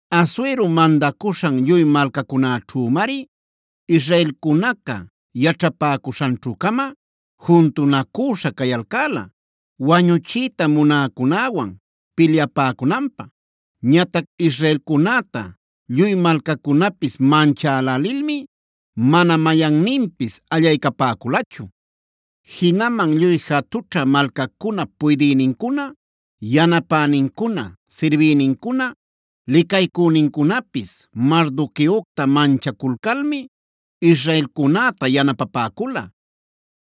Asuero mandacuśhan lluy malcacunäćhümari israelcunaca yaćhapäcuśhanćhu-cama juntunacüśha cayalcäla wañuchiyta munäcunäwan pilyapäcunanpä. Ñatac israelcunäta lluy malcacunapis manchälälilmi mana mayanninpis allaycapäculachu. Jinaman lluy jatućhä malcacunap puydïnincuna, yanapänincuna, sirbïnincuna, licaycünincunapis Mardoqueocta manchaculcalmi israelcunäta yanapapäcula.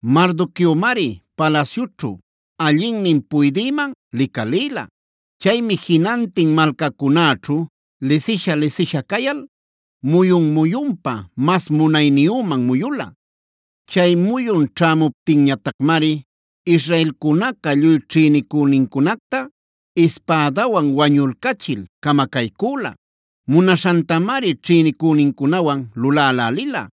Mardoqueomari palasyućhu allinnin puydïman licalïla. Chaymi jinantin malcacunaćhu lisisha-lisisha cayal muyun-muyunpa, mas munayniyüman muyula. Chay muyun ćhämuptinñatacmari israelcunaca lluy ćhïnicünincunacta ispädawan wañulcachil camacaycüla; munaśhantamari ćhïnicünincunawan lulälälila.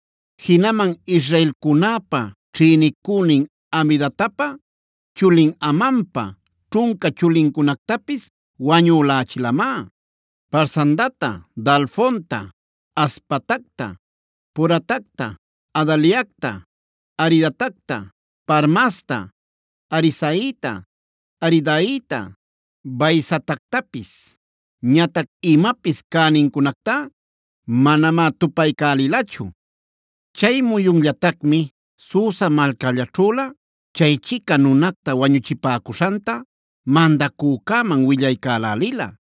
Jinaman israelcunäpa ćhïnicünin Hamedatapa chulin Amanpa ćhunca chulincunactapis wañulächilamá: Parsandata, Dalfonta, Aspatacta, Poratacta, Adaliacta, Aridatacta, Parmasta, Arisaita, Aridaita, Vaizatactapis. Ñatac imapis cänincunactá manamá tupaycälilachu. Chay muyunllatacmi Susa malcällaćhülä chaychica nunacta wañuchipäcuśhanta mandacücäman willaycälälila.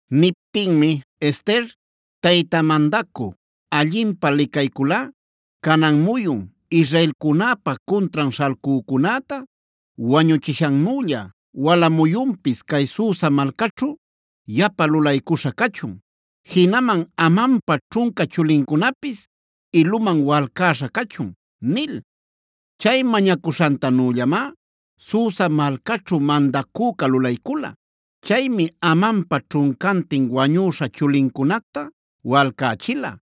Niptinmi Ester: “Tayta mandacü, allinpä licayculꞌa, canan muyun israelcunäpa cuntran śhalcücunäta wañuchishannülla wala muyunpis cay Susa malcaćhu yapa lulaycuśha cachun. Jinaman Amanpa ćhunca chulincunapis iluman walcäśha cachun” nil. Chay mañacuśhantanüllamá Susa malcaćhu mandacüca lulaycula. Chaymi Amanpa ćhuncantin wañüśha chulincunacta walcächila.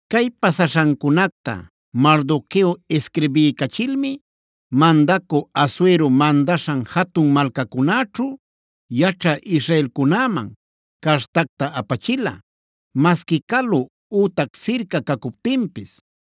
Cay pasaśhancunacta Mardoqueo isquirbiycachilmi, mandacü Asuero mandaśhan jatun malcacunäćhu yaćhä israelcunäman cartacta apachila, masqui calu ütac sirca cacuptinpis.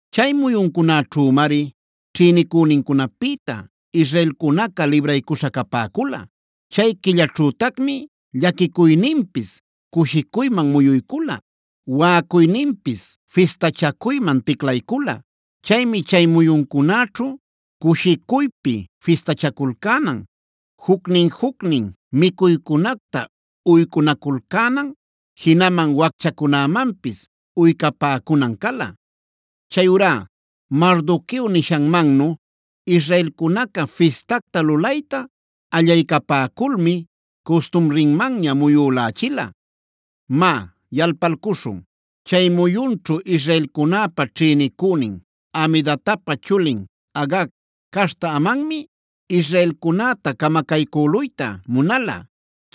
Chay muyuncunäćhümari ćhïnicünincunapïta israelcunaca libraycuśha capäcula; chay quillaćhütacmi llaquicuyninpis cushicuyman muyuycula, waꞌacuyninpis fistachacuyman ticlaycula. Chaymi chay muyuncunäćhu cushicuypi fistachaculcänan, jucnin-jucnin micuycunacta uycunaculcänan, jinaman wacchacunämanpis uycapäcunan cala. Chayurá Mardoqueo nishanmannu israelcunaca fistacta lulayta allaycapäculmi custumrinmanña muyülächila. Má yalpalcuśhun, chay muyunćhu israelcunäpa ćhïnicünin Hamedatapa chulin Agag caśhta Amanmi, israelcunäta camacaycüluyta munala.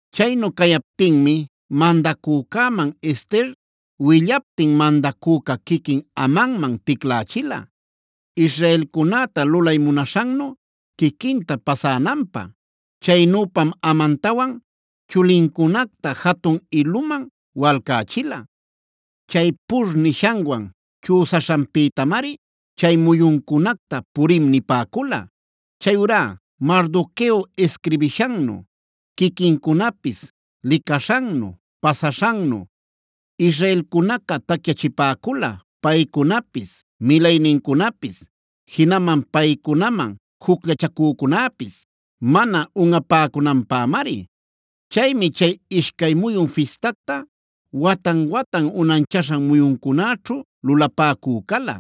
Chaynu cayaptinmi mandacücäman Ester willaptin mandacüca quiquin Amanman ticlächila, israelcunäta lulay munaśhannu quiquinta pasänanpä. Chaynüpam Amantawan chulincunacta jatun iluman walcächila. Chay Purb nishanwan chüsaśhanpïtamari chay muyuncunacta Purim nipäcula. Chayurá Mardoqueo isquirbishannu quiquincunapis licaśhannu pasaśhannu, israelcunaca tacyachipäcula paycunapis, milaynincunapis, jinaman paycunaman jucllachacücunäpis mana unꞌapäcunanpämari. Chaymi cay ishcay muyun fistacta watan-watan unanchaśhan muyuncunäćhu lulapäcü cala.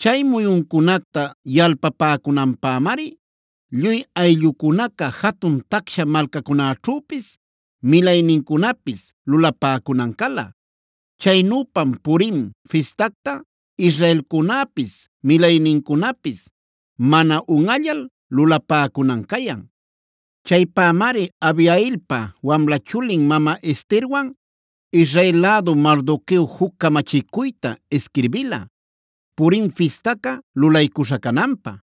Chay muyuncunacta yalpapäcunanpämari lluy ayllucunaca jatun tacsha malcacunäćhüpis, milaynincunapis lulapäcunan cala. Chaynüpam Purim fistacta israelcunäpis milaynincunapis mana unꞌallal lulapäcunan cayan. Chaypämari Abihailpa wamla chulin mama Esterwan Israel lädu Mardoqueo juc camachicuyta isquirbila, Purim fistaca lulaycuśha cananpä.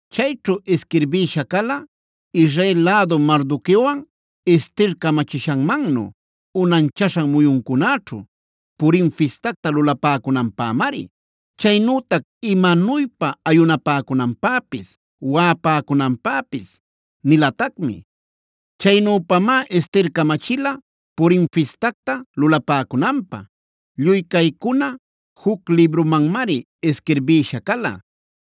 Chayćhu isquirbïsha cala Israel lädu Mardoqueowan Ester camachishanmannu unanchaśhan muyuncunäćhu Purim fistacta lulapäcunanpämari. Chaynütac imanuypa ayunapäcunanpäpis, waꞌapäcunanpäpis nilatacmi. Chaynüpamá Ester camachila Purim fistacta lulapäcunanpä. Lluy caycuna juc librumanmari isquirbïsha cala.